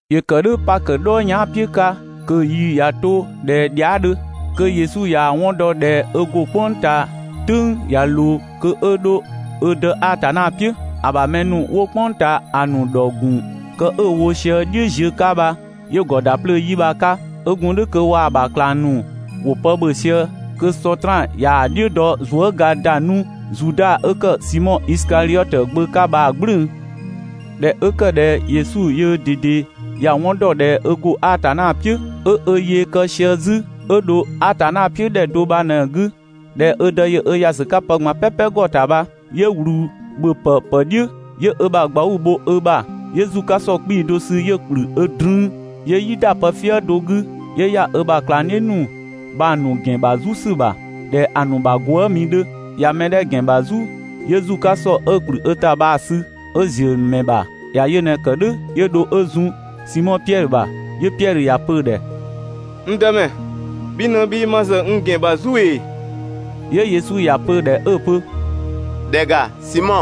‑Yö ‑kë "dhʋ̈ Pakö "dhɔɔ yɛan" "piʋ̈ 'ka kö‑ yi ꞊ya 'to ꞊dhɛ dhia" 'dhö, kö Yesu ꞊yaa‑ 'wɔn dɔ ꞊dhɛ ö ‑go "kpʋng ꞊taa "tʋ̈ng ꞊ya ꞊loo kö 'ö 'dho ö Dë Atanna "piʋ̈. ‑A ‑bha mɛ ‑nu 'wo "kpʋng ꞊taa ‑a ‑nu ‑dhɔ ‑gun kë 'ö‑ wo sië "dhiʋ̈ ziö 'ka bha, 'yö‑ ‑gɔ ‑da 'plöö yi bha‑ 'ka. 'Ö gun "dhʋ̈ kö waa‑ ‑bha ꞊klang ‑nu ‑wo pë ‑bhö sië, kö Sɔtraan ꞊yaa‑ "dhiʋ̈ dɔ zuëga ‑da 'nu Zuda 'ö ‑kë Simɔ Isikadhiɔtö gbö 'ka bha‑ "gblʋ̈ʋ̈‑. ꞊Dhɛ 'ö ‑kë ꞊dhɛ Yesu yöö ꞊dede ‑ya 'wɔn ‑dɔ ꞊dhɛ ö ‑go Atanna "piʋ̈, 'ö ö yee kë sië 'zü 'ö dho Atanna "piʋ̈ ‑dhɛ do bha ꞊në‑ 'gü, ꞊dhɛ ö Dë ‑yö ö ‑ya sü 'ka pë ꞊gban "pɛpɛ ‑gɔ ‑ta bha, 'yö ꞊wlü ‑bhöpë ‑pë "dhiʋ̈, 'yö ö ‑bha ꞊gbauu‑ bho ö ‑bha, 'yö ‑zu 'ka ‑sɔ 'kpii‑ do sü 'yö‑ ‑kplü ö 'drüü. 'Yö "yi ‑da pëfië do 'gü, 'yö ‑ya ö ‑bha ꞊klangdhiʋ̈ ‑nu bha‑ ‑nu ‑gɛn ‑bha "zu ‑sü ‑bha ꞊dhɛ ‑a ‑nu bha gwëëmi 'dhö. ꞊Ya mɛ 'dhɛ‑ ‑gɛn ‑bha "zu, 'yö ‑zu 'ka ‑sɔ 'ö‑ ‑kplü ö ‑ta bha‑ sü 'ö‑ ‑ziö ‑mɛ ‑bha. ‑Ya yö ꞊në‑ ‑kë "dhʋ̈ 'yö dho 'ö zun Simɔ Piɛdhö ‑bha. 'Yö Piɛdhö ‑ya pö‑ ‑dhɛ: «N Dëmɛ, bhi ꞊në, bhii ma ‑zë n ‑gɛn ‑bha "zu ‑ee?» 'Yö Yesu ‑ya pö‑ ‑dhɛ 'ö‑ pö: «‑Dhɛ ‑ga, Simɔ,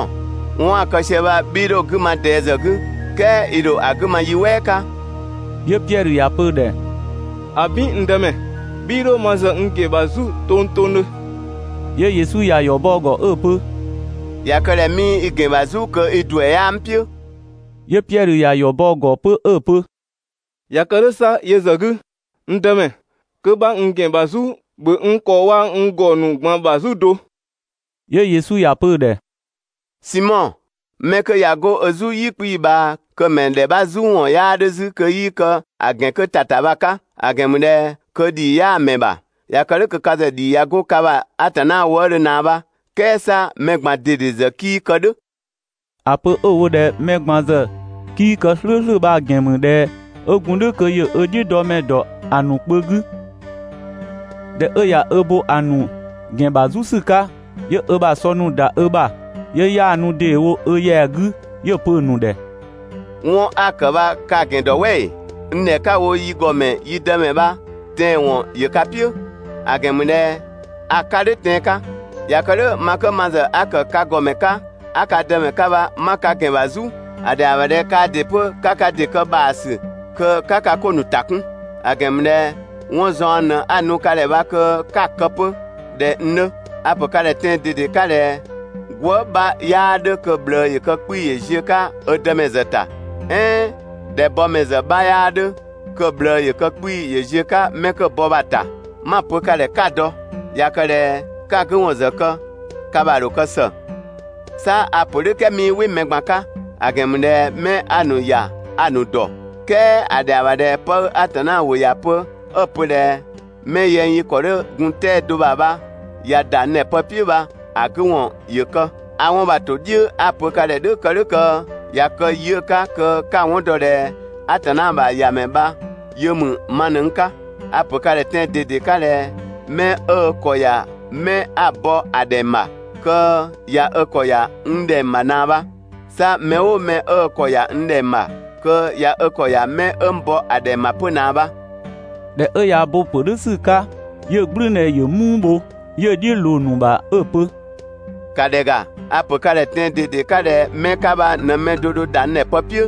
'wɔn 'a‑ kë sië bha 'bhii 'dho‑ 'gü ma ꞊dɛɛ ‑zë 'gü, "kɛɛ i ‑dho ‑a 'gü ma yi "wɛɛ 'ka.» 'Yö Piɛdhö ‑ya pö‑ ‑dhɛ: «‑Abin! N Dëmɛ, 'bhii 'dho ma ‑zë n ‑gɛn ‑bha "zu tongtongdhö!» 'Yö Yesu ‑ya ‑yɔ bɔ‑ ‑gɔ 'ö‑ pö: «꞊Ya kë ꞊dhɛ 'mii i ‑gɛn bha "zu kö i ‑duɛ 'yaa n "piʋ̈.» 'Yö Piɛdhö ‑ya ‑yɔ bɔ‑ ‑gɔ 'pö 'ö‑ pö: «꞊Ya kë "dhʋ̈ 'sa yö ‑zë 'gü, n Dëmɛ, kö 'bha n ‑gɛn ‑bha "zu, ‑bhö n ‑kɔ waa‑ n ‑gɔ ‑nu ꞊gban ‑bha "zu do!» 'Yö Yesu ‑ya pö‑ ‑dhɛ: «Simɔ, 'mɛ 'kö ꞊ya 'go ö "zu "yi 'kpii‑ ꞊bhaa kö‑ ‑mɛ ‑dhɛ 'bha "zu ‑wɔn 'yaa 'dhö 'zü kö 'yii kë‑ ‑gɛn 'kö ‑ta ‑ta bha‑ 'ka, ‑a ‑gɛn ‑mü ꞊dhɛ kö ‑dhii 'yaa‑ ‑mɛ ‑bha. ꞊Ya kë "dhʋ̈ kö ka ‑zë ‑dhii ꞊ya 'go ka ‑bha Atanna wëëdhö ꞊naa bha, "kɛɛ 'sa mɛ ꞊gban ꞊dede ‑zë 'kii kë "dhʋ̈.» ‑A pö 'ö‑ wo ꞊dhɛ mɛ ꞊gban ‑zë 'kii kë "slʋ̈ʋ̈slʋ̈ bha‑ ‑gɛn ‑mü ꞊dhɛ 'ö gun "dhʋ̈ kö ‑yö ö "dhiʋ̈dɔmɛ ‑dɔ ‑a ‑nu kpö 'gü. ꞊Dhɛ 'ö ꞊ya ö bo‑ ‑nu ‑gɛn ‑bha "zu ‑sü 'ka, 'yö ö ‑bha sɔ ‑nu ‑da ö ‑bha, 'yö 'yaanu ‑deewo ö ‑yɛa 'gü 'yö‑ pö‑ ‑nu ‑dhɛ: «'Wɔn 'a‑ ‑kë bha ka‑ ‑gɛn ‑dɔ "wɛ ‑ee? N ‑dhɛ 'ka‑ wo «yi ‑Gɔmɛ» «yi Dëmɛ» bha tɛanwɔn ‑yö ka "piʋ̈, ‑a ‑gɛn ‑mü ꞊dhɛ a‑ 'ka "dhʋ̈ tɛan‑ 'ka.» ꞊Ya kë "dhʋ̈ ma 'kö ma ‑zë 'a ‑kë ka ‑gɔmɛ 'ka 'a ka Dëmɛ 'ka bha 'ma ka ‑gɛn ‑bha "zu, ‑a ‑dhɛa ‑bha ꞊dhɛ kaa ‑dɩ 'pö 'ka ka ‑dɩ kë ‑bha ‑sü kö 'ka ka 'ko ‑nu ‑ta 'kun; ‑a ‑gɛn ‑mü ꞊dhɛ 'wɔn zaɔn ꞊në 'a‑ nu ka ‑dhɛ bha kö 'ka‑ kë 'pö ꞊dhɛ n 'dhö. A‑ ‑pö ka ‑dhɛ tɛan‑ ꞊dede 'ka ꞊dhɛ gwëë" 'bha 'yaa 'dhö kö‑ ꞊bhlëë ‑yö kë 'kpii‑ ‑yö ziö‑ 'ka ö dëmɛ ‑zë ‑ta, "ɛɛn ꞊dhɛ bɔmɛ ‑zë 'bha 'yaa 'dhö kö‑ ꞊bhlëë ‑yö kë 'kpii‑ ‑yö ziö‑ 'ka 'mɛ 'kö‑ bɔ bha‑ ‑ta. 'Ma‑ pö ka ‑dhɛ 'ka‑ dɔ. ꞊Ya kë ꞊dhɛ 'ka‑ 'gü ‑wɔn ‑zë kë, ka ‑bha ‑dho kë ‑së. 'Sa a‑ ‑pö "dhʋ̈ "kɛɛ 'mii "wɩ mɛ ꞊gban 'ka, ‑a ‑gɛn ‑mü ꞊dhɛ 'mɛ 'a‑ ‑nu ‑ya a‑ ‑nu ‑dɔ. "Kɛɛ ‑a ‑dhɛa ‑bha ꞊dhɛ 'pë 'ö Atanna ‑wʋ ‑ya pö 'ö‑ pö ꞊dhɛ: ‹'Mɛ yɛng yi ‑kɔ 'dhö gun 'tɛa‑ do ‑bha bha ꞊ya ‑da n ‑dhɛ pë "piʋ̈› bha‑ 'gü ‑wɔn ‑yö kë. A 'wɔn bha‑ ‑to "dhiʋ̈ 'a‑ pö ka ‑dhɛ "dhʋ̈ kë "dhʋ̈ kö ꞊ya kë yi 'ö‑ 'ka kö 'ka‑ 'wɔn dɔ ꞊dhɛ Atanna ‑bha ‑Yamɛ bha yö ‑mü ma ꞊në n 'ka. A‑ ‑pö ka ‑dhɛ tɛan‑ ꞊dede 'ka ꞊dhɛ 'mɛ 'ö ö ‑kɔ ‑ya 'mɛ 'a‑ bɔ ‑a ‑dhɛng ‑bha, kö ꞊ya ö ‑kɔ ‑ya n ‑dhɛng ‑bha ꞊naa bha. 'Sa mɛ "ʋʋ mɛ 'ö ö ‑kɔ ‑ya n ‑dhɛng ‑bha kö ꞊ya ö ‑kɔ ‑ya 'mɛ 'ö n bɔ ‑a ‑dhɛng ‑bha 'pö ꞊naa bha.» ꞊Dhɛ 'ö ꞊ya ö bo‑ ‑pö "dhʋ̈ ‑sü 'ka 'yö‑ "gblʋ̈ʋ̈dhɛ ‑yö "muu bho, 'yö‑ "dhiʋ̈ ꞊loo‑ ‑nu ‑bha 'ö‑ pö «‑Ka ‑dhɛ ‑ga, a‑ ‑pö ka ‑dhɛ tɛan‑ ꞊dede 'ka ꞊dhɛ 'mɛ 'ka bha ꞊në‑ mɛ do dho ‑da n ‑dhɛ pë "piʋ̈.»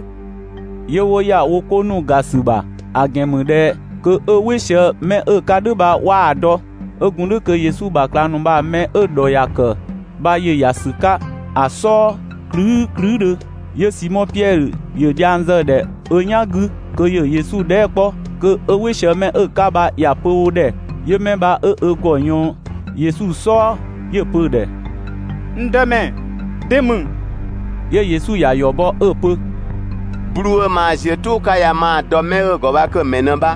'Yö 'wo ‑ya wo 'ko ‑ga ‑sü ‑bha, ‑a ‑gɛn ‑mü ꞊dhɛ kö 'ö "wɩ sië 'mɛ 'ö‑ 'ka "dhʋ̈ bha 'waa‑ dɔ. 'Ö gun "dhʋ̈ kö Yesu ‑bha ꞊klang ‑nu bha‑ ‑mɛ 'dhɛ 'ö‑ ‑dhɔ ‑ya kë bha ‑yö ‑ya ‑sü 'ka‑ "sɔɔ klüü" klüüdhö. 'Yö Simɔ Piɛdhö ‑yö dhiang zë‑ ‑dhɛ ö "yanga 'gü kö ‑yö Yesu dhɛɛ" 'kpɔ kö 'ö "wɩ sië 'mɛ 'ö‑ 'ka bha ‑ya pö wo ‑dhɛ. 'Yö 'mɛ bha 'ö ö ‑gɔ ꞊yɔɔn Yesu "sɔɔ 'yö‑ pö‑ ‑dhɛ: «N Dëmɛ, de ‑mü?» 'Yö Yesu ‑ya ‑yɔ bɔ 'ö‑ pö: «'Bluu‑ 'ö maa ziö "tʋʋ 'ka ya maa‑ ‑dɔ mɛ 'ö‑ ‑gɔ bha kö‑ ‑mɛ ꞊në bha.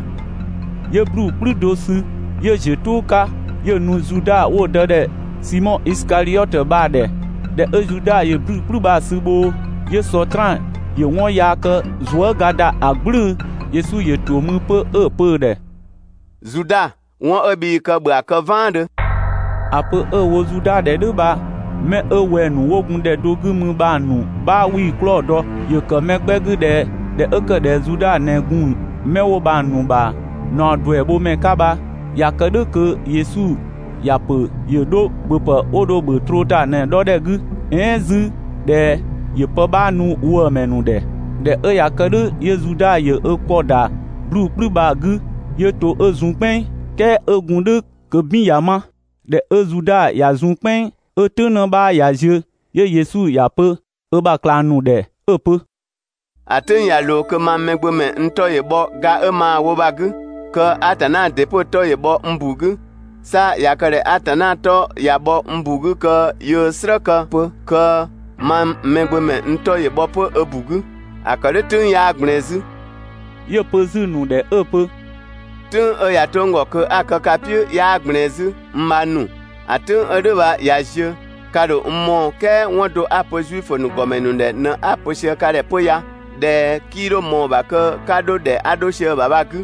'Yö 'bluu‑ "kplü do sü, 'yö‑ ‑ziö "tʋʋ 'ka 'yö‑ nu Zuda 'wo‑ dë ‑dhɛ Simɔ Isikadhiɔtö bha‑ ‑dhɛ. ꞊Dhɛ 'ö Zuda ‑yö 'bluu‑ "kplü bha‑ 'sü bhoo, 'yö Sɔtraan ‑yö 'wɔn yaa kë zuëga ‑da ‑a "gblʋ̈ʋ̈‑. Yesu ‑yö ‑to mü 'pö 'ö‑ pö‑ ‑dhɛ: «Zuda, 'wɔn 'ö bhii‑ kë ‑bhö ‑a kë "vaandhö!» ‑A pö 'ö‑ wo Zuda ‑dhɛ "dhʋ̈ bha 'mɛ 'ö wɛng‑ ‑nu 'wo gun ‑dhɛ do 'gü mü bha‑ ‑nu 'bha 'wii‑ 'klɔɔ‑ dɔ. ‑Yö ‑kë mɛ 'gbɛ 'gü ꞊dhɛ ꞊dhɛ 'ö ‑kë ꞊dhɛ Zuda ꞊në gun 'mɛ 'wo bha‑ ‑nu ‑bha ꞊naɔ ‑duɛ bho ‑mɛ 'ka bha ꞊Ya kë "dhʋ̈ kö Yesu ‑ya ‑pö ‑yö 'dho ‑bhöpë 'wo dho‑ ‑bhö troo ‑ta ꞊në‑ 'dhɔ ‑dhɛ 'gü, "ɛɛn 'zü ꞊dhɛ ‑yö pë 'bha nu ‑wëëmɛ ‑nu ‑dhɛ. ꞊Dhɛ 'ö ꞊ya kë "dhʋ̈ 'yö Zuda ‑yö 'ö ‑kɔ ‑da 'bluu‑ "kplü bha‑ 'gü, 'yö to 'ö zun "kpɛnng, "kɛɛ 'ö gun "dhʋ̈ kö "bin ꞊ya 'ma. ꞊Dhɛ 'ö Zuda ꞊ya zun "kpɛnng 'ö "tʋ̈ng 'në 'bha ꞊ya ziö, 'yö Yesu ‑ya pö ö ‑bha ꞊klang ‑nu ‑dhɛ 'ö‑ pö: «‑A "tʋ̈ng ꞊ya ꞊loo kö mang Mɛgbömɛ n 'tɔ ‑yö bhɔ ga 'ö maa‑ wo bha‑ 'gü, kö Atanna ‑dɩ 'pö‑ 'tɔ ‑yö bhɔ n ‑bu 'gü. 'Sa ꞊ya kë ꞊dhɛ Atanna 'tɔ ꞊ya bhɔ n ‑bu 'gü kö yöö‑ "slë kë 'pö kö mang Mɛgbömɛ n 'tɔ ‑yö bhɔ 'pö ö ‑bu 'gü. ‑A ‑kë "dhʋ̈ "tʋ̈ng 'yaa ꞊gblɛɛn 'zü.» 'Yö‑ pö 'zü‑ ‑nu ‑dhɛ 'ö‑ pö: «"Tʋ̈ng 'ö ꞊ya 'to n ‑gɔ kö 'a‑ kë ka "piʋ̈ 'yaa ꞊gblɛɛn 'zü, n bhang ‑nu, ‑a "tʋ̈ng 'ö "dhʋ̈ bha ꞊ya ziö, ka ‑dho n mɔɔ‑ "kɛɛ 'wɔn do 'a‑ pö Zuifö ‑nu ‑gɔmɛ ‑nu ‑dhɛ ꞊në 'a‑ ‑pö sië ka ‑dhɛ 'pö ya, ꞊dhɛ 'kii 'dho ꞊mɔɔ‑ ‑bha kö 'ka 'dho ‑dhɛ 'a 'dho sië‑ ‑bha bha‑ 'gü.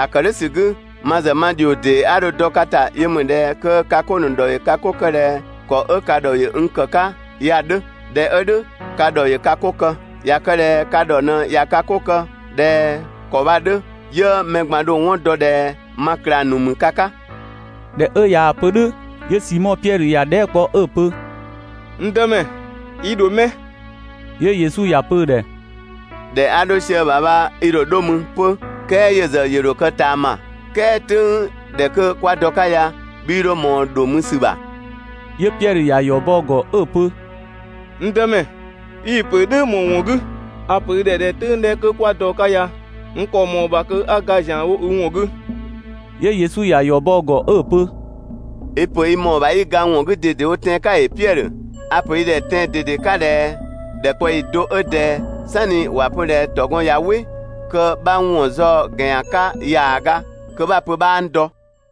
‑A ‑kë "dhʋ̈ ‑sü 'gü, ma ‑zë ma ‑dhio ‑dee 'a dho‑ dɔ ka ‑ta 'yö ‑mü ꞊dhɛ kö ka 'ko ‑nu ‑dhɔ ‑yö ka 'ko kë ꞊dhɛ ‑kɔ 'ö ka ‑dhɔ ‑yö n ‑kë 'ka ya‑ 'dhö. ꞊Dhɛ 'ö "dhʋ̈, ka ‑dhɔ ‑yö ka 'ko kë. ꞊Ya kë ꞊dhɛ ka ‑dhɔ ꞊në ꞊ya ka 'ko kë ꞊dhɛ ‑kɔ bha‑ 'dhö, 'yö mɛ ꞊gban‑ dho‑ 'wɔn dɔ ꞊dhɛ ma ꞊klang ‑nu ‑mü ka 'ka. ‑Dhɛ 'ö ꞊yaa‑ pö "dhʋ̈ 'yö Simɔ Piɛdhö ‑ya dhɛɛ" kpɔ 'ö‑ pö: «N Dëmɛ, i ‑dho 'mɛ?» 'Yö Yesu ‑ya pö‑ ‑dhɛ: «‑Dhɛ 'a 'dho sië‑ ‑bha bha i ‑dho 'dho mü ('pö "kɛɛ yö ‑zë ‑yö ‑dho kë), "kɛɛ "tʋ̈ng ‑dhɛ 'kö 'kwa dɔ‑ 'ka ya 'bhii 'dho ꞊mɔɔ ‑dho mü ‑sü ‑bha.» 'Yö Piɛdhö ‑ya ‑yɔ bɔ‑ ‑gɔ 'ö‑ pö: «N Dëmɛ, i‑ ‑pö "dhʋ̈ ‑më ‑wɔn 'gü? A‑ ‑pö i ‑dhɛ ꞊dhɛ "tʋ̈ng kwa dɔ‑ 'ka ya n ‑kɔ ‑mɔɔ ‑bha kö 'a ga ‑zianwo i ‑wɔn 'gü!» 'Yö Yesu ‑ya ‑yɔ bɔ‑ ‑gɔ 'ö‑ pö: «I‑ ‑pö i ‑mɔɔ ‑bha 'i ga n ‑wɔn 'gü ꞊dedewo tɛan‑ 'ka ‑ee, Piɛdhö? A‑ ‑pö i ‑dhɛ tɛan‑ ꞊dede 'ka ꞊dhɛ ‑dhɛkpaɔyi do 'ö ꞊dɛɛ, "sanni ‑wa pö ꞊dhɛ ‑tɔgɔn ꞊ya "wɩ, kö 'bha n ‑wɔn zaɔ‑ ‑gɛn ‑yan 'ka ‑yaaga, (kö 'bha‑ pö 'bhaa n dɔ).»